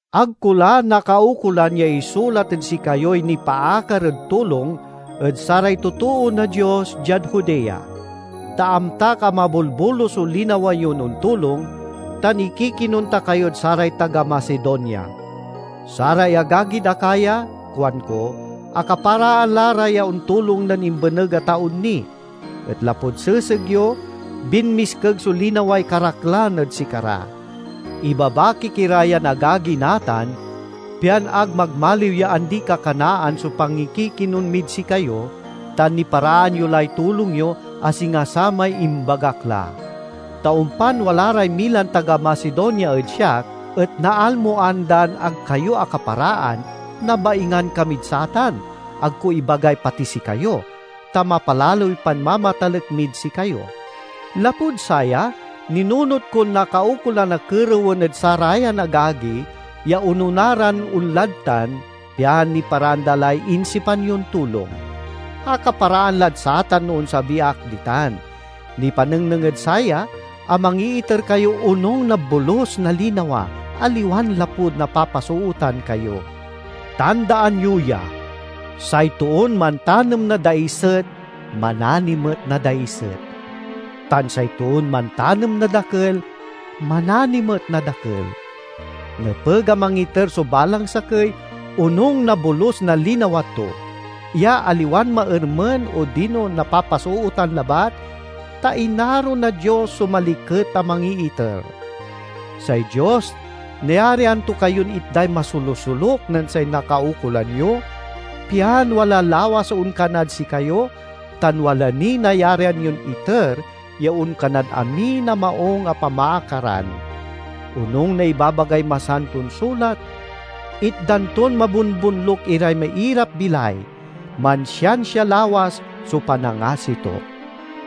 Ag ko la nakaukolan ya isulat ed sikayoy nipaakar ed tulong ed saray totoo na Dios, diad Judea. Ta amtak a mabolbolus so linawa yon ontulong, tan ikikinon ta kayod saray taga Macedonia. "Saray agagid Acaya," kuanko, "akaparaan la ra ya ontulong nen imbeneg a taon ni." Et lapud seseg yo binmiskeg so linaway karaklan ed sikara. Ibabakik ira yan agagi natan, pian ag magmaliw ya andi-kakanaan so pangikikinon mid sikayo, tan niparaan yo lay tulong yo, a singa samay imbagak la. Ta ompan wala ray milan taga Macedonia ed siak et naalmoan dan ag kayo akaparaan, nabaingan kamid satan—ag ko ibagay pati sikayo—ta mapalaloy panmamatalek mid sikayo. Lapud saya, ninunot kon nakaukolan a kerewen ed sarayan agagi ya onona ran onlad tan, pian niparaan da lay insipan yon tulong. Akaparaan lad satan no onsabi ak ditan; nipanengneng ed saya a mangiiter kayo onung na bolus na linawa, aliwan lapud napapasootan kayo. Tandaan yo ya: say toon mantanem na daiset manani met na daiset; tan say toon mantanem na dakel manani met na dakel. Nepeg a mangiter so balang sakey, onung na bolus na linawa to, ya aliwan maermen odino napapasootan labat, ta inaro na Dios so maliket a mangiiter. Say Dios nayarian to kayon itday masolusoluk nen say nakaukolan yo, pian wala lawas so onkanad sikayo tan wala niy nayarian yon iter ya onkanad amin a maung a pamaakaran. Onung na ibabagay Masanton Sulat, "Itdan ton mabonbonluk iray mairap-bilay; mansiansia lawas so panangasi to."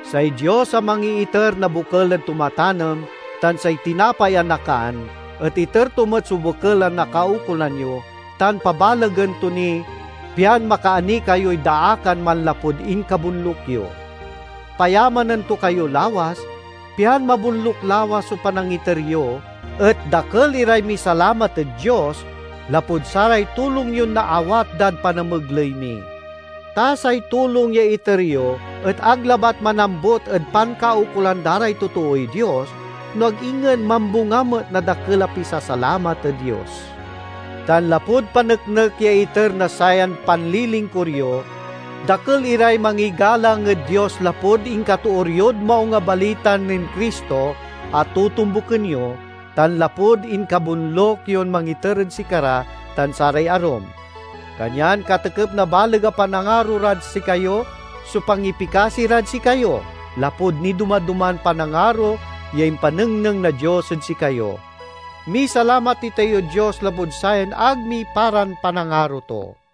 Say Dios a mangiiter na bokel ed tumatanem tan say tinapay a nakan et iter to met so bokel a nakaukolan yo, tan pabalegen to ni pian makaani kayoy daakan manlapud inkabonluk yo. Payamanen to kayo lawas, pian mabonluk lawas so panangiter yo, et dakel iray misalamat ed Dios lapud saray tulong yon naawat dad panamegley mi. Ta say tulong ya iter yo et ag labat manambut ed pankaukolan da ray totooy Dios, no ag ingen mambunga met na dakel a pisasalamat ed Dios. Tan lapud paneknek ya iter na sayan panlilingkur yo, dakel iray mangigalang ed Dios lapud inkatoor yod Maung a Balita nen Cristo a totombuken yo, tan lapud inkabonluk yon mangiter ed sikara tan saray arum. Kanyan katekep na baleg a panangaro rad sikayo so pangipikasi rad sikayo, lapud nidoma-doman panangaro ya impanengneng na Dios ed sikayo. Misalamat itayod Dios lapud sayan ag miparan panangaro to!